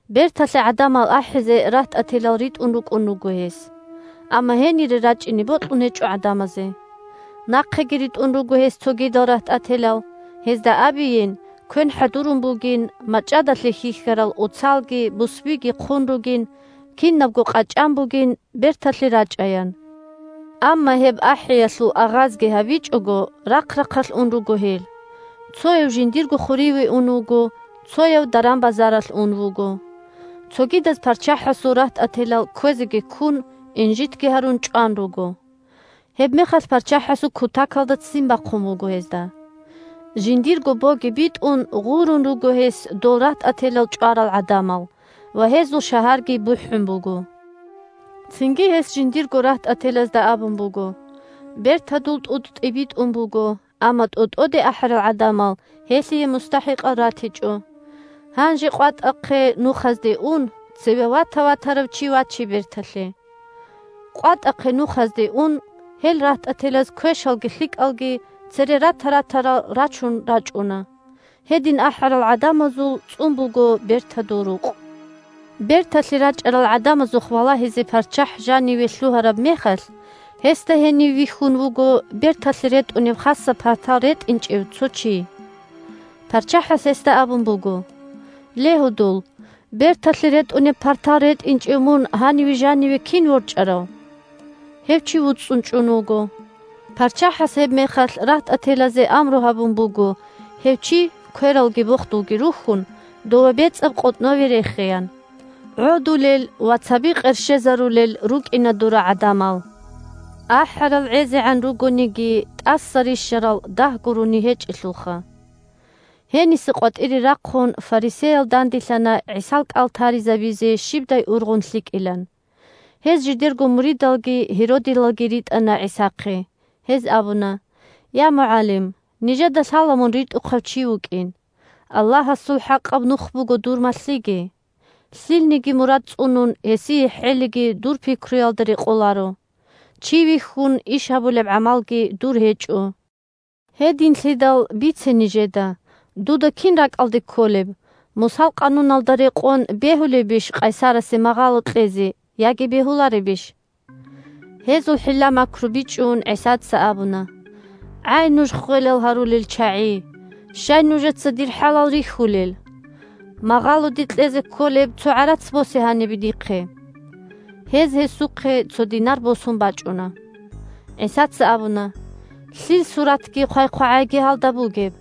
Берталъе гӀадамал ахӀизе рагьтӀателал ритӀун рукӀун руго гьес, амма гьенире рачӀине бокьун гьечӀо гӀадамазе. Нахъеги ритӀун руго гьес цогидал рагьтӀателал, гьезда абейин, квен хӀадурун бугин, мачӀадалъе хьихьарал оцалги бусбиги хъун ругин, кинабго къачӀан бугин, берталъе рачӀаян. Амма гьеб ахӀиялъул агъазги гьабичӀого, рахъ-рахъалъ ун руго гьел: цояв жиндирго хуриве ун вуго, цояв даран-базаралъ ун вуго. Цогидаз парччахӀасул рагьтӀателал, кквезеги ккун, инжитги гьарун, чӀван руго. Гьебмехалъ парччахӀасул кутакалда ццин бахъун буго гьезда. Жиндирго боги битӀун гъурун руго гьес дол рагьтӀателал чӀварал гӀадамал ва гьезул шагьарги бухӀун буго. Цинги гьес жиндирго рагьтӀателазда абун буго: – Бертадул тӀутӀ тӀибитӀун буго, амма тӀотӀоде ахӀарал гӀадамал гьелъие мустахӀикъал ратичӀо. Гьанже къватӀахъе-нухазде ун, цеве вата-ватарав чи ваче берталъе. КъватӀахъе-нухазде ун гьел рагьтӀателаз квешалги лъикӀалги – цере рата-ратарал рачун рачӀуна. Гьедин ахӀарал гӀадамазул цӀун буго бертадул рукъ. Берталъе рачӀарал гӀадамазухъ валагьизе парччахӀ жаниве лъугьараб мехалъ, гьесда гьенив вихьун вуго берталъе ретӀунеб хасаб партал ретӀинчӀев цо чи. ПарччахӀас гьесда абун буго: «Ле, гьудул, берталъе ретӀунеб партал ретӀинчӀев мун гьаниве жаниве кин ворчӀарав?» Гьев чи вуцӀцӀун чӀун вуго. ПарччахӀас гьебмехалъ рагьтӀателазе амру гьабун буго гьев чи, квералги бохдулги рухьун, дове бецӀаб къотӀнове рехеян. ГӀодулел ва цаби къерщезарулел рукӀина дора гӀадамал. АхӀарал гӀезегӀан ругониги, тӀаса рищарал дагь гурони гьечӀелъулха! Гьениса къватӀире рахъун фарисеял данделъана ГӀисал кӀал таризабизе щибдай ургъун лъикӀилан. Гьез жидерго муридалги гьеродилалги Гьеродилал – Гьерод ханасул рахъ ккурал гӀадамал. ритӀана ГӀисахъе. Гьез абуна: – Я, МугӀалим! Нижеда лъала мун ритӀухъав чи вукӀин. Аллагьасул хӀакъаб нух буго дур малъиги. Лъилниги мурад цӀунун, гьесие хӀелиги дур пикруялда рекъоларо. Чи вихьун иш гьабулеб гӀамалги дур гьечӀо. Гьединлъидал, бице нижеда. Дуда кин ракӀалде кколеб: Мусал Къануналда рекъон бегьулебищ къайсарасе магъало кьезе яги бегьуларебищ? Гьезул хӀилла-макру бичӀчӀун, ГӀисаца абуна: – ГӀай, нуж ххвелал гьарулел чагӀи! Щай нужеца дир хӀалал рихьулел? Магъалоде кьезе кколеб цо гӀарац босе гьанибе дихъе. Гьез гьесухъе цо динар босун бачӀуна. ГӀисаца абуна: – Лъил суратги хъвай-хъвагӀайги гьалда бугеб?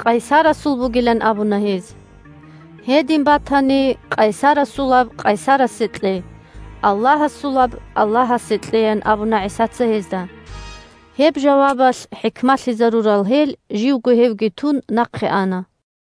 Къайсарасул бугилан абуна гьез. – Гьедин батани, къайсарасулаб къайсарасе кье, Аллагьасулаб Аллагьасе кье, – ян абуна ГӀисаца гьезда. Гьеб жавабалъ хӀикмалъизарурал гьел, живго гьевги тун, нахъе ана.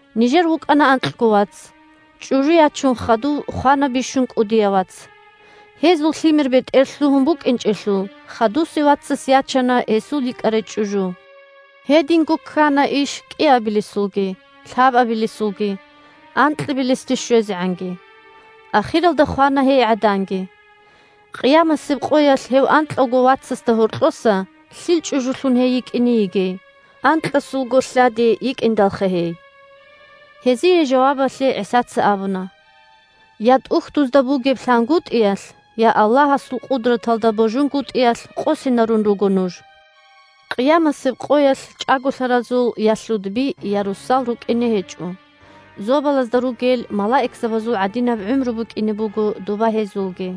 Нижер вукӀана анкьго вац. ЧӀужу ячун хадув хвана бищун кӀудияв вац. Гьезул лъимер-бетӀер лъугьун букӀинчӀелъул, хадусев вацас ячана гьесул йикӀарай чӀужу. Гьединго ккана иш кӀиабилесулги, лъабабилесулги, анкьабилесде щвезегӀанги. Ахиралда хвана гьей гӀаданги. Къиямасеб къоялъ гьев анкьавго вацасда гьоркьоса лъил чӀужулъун гьей йикӀине йигей? Анкьасулго лъади йикӀиндалха гьей. Гьезие жавабалъе ГӀисаца абуна: – Я ТӀухьдузда бугеб лъангутӀиялъ, я Аллагьасул къудраталда божунгутӀиялъ къосинарун руго нуж. Къиямасеб къоялъ чӀаголъаразул я лъудби, я росал рукӀине гьечӀо, зобалазда ругел малаикзабазул гӀадинаб гӀумру букӀине буго доба гьезулги.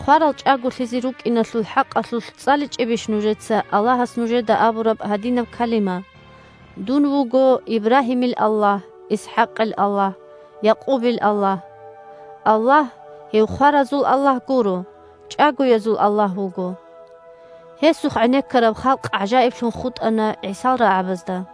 Хварал чӀаголъизе рукӀиналъул хӀакъалъулъ цӀаличӀебищ нужеца Аллагьас нужеда абураб гьадинаб калима: «Дун вуго Ибрагьимил Аллагь, ИсхӀакъил Аллагь, Якъубил Аллагь»? Аллагь – гьев хваразул Аллагь гуро, чӀагоязул Аллагь вуго. Гьесухъ гӀенеккараб халкъ гӀажаиблъун хутӀана ГӀисал рагӀабазда.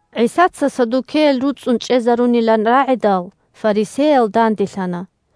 ГӀисаца саддукеял руцӀцӀун чӀезарунилан рагӀидал, фарисеял данделъана.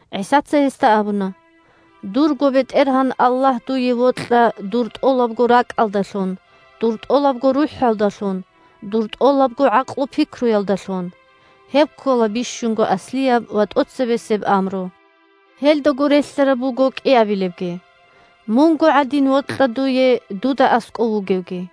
ГӀисаца гьесда абуна: – «Дурго БетӀергьан Аллагь дуе вокьа дур тӀолабго ракӀалдалъун, дур тӀолабго рухӀалдалъун, дур тӀолабго гӀакълу-пикруялдалъун». Гьеб ккола бищунго аслияб ва тӀоцебесеб амру. Гьелдаго релълъараб буго кӀиабилебги: «Мунго гӀадин вокьа дуе дуда аскӀов вугевги».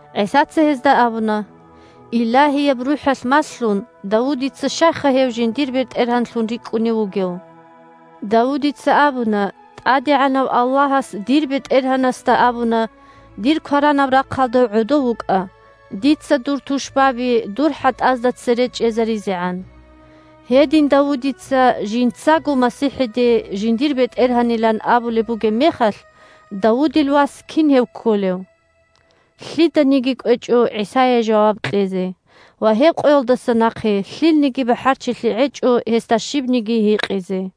ГӀисаца гьезда абуна: – Илагьияб РухӀалъ малъун, Давудица щайха гьев жиндир БетӀергьанлъун рикӀкӀунев вугев? Давудица абуна: «ТӀадегӀанав Аллагьас дир БетӀергьанасда абуна: „Дир кваранаб рахъалда гӀодов вукӀа, дица дур тушбаби дур хӀатӀазда цере чӀезаризегӀан“». Гьедин Давудица жинцаго МасихӀиде жиндир БетӀергьанилан абулеб бугеб мехалъ, Давудил вас кин гьев кколев? Лъиданиги кӀвечӀо ГӀисае жаваб кьезе, ва гьеб къоялдаса нахъе лъилниги бахӀарчилъи гӀечӀо гьесда щибниги гьикъизе.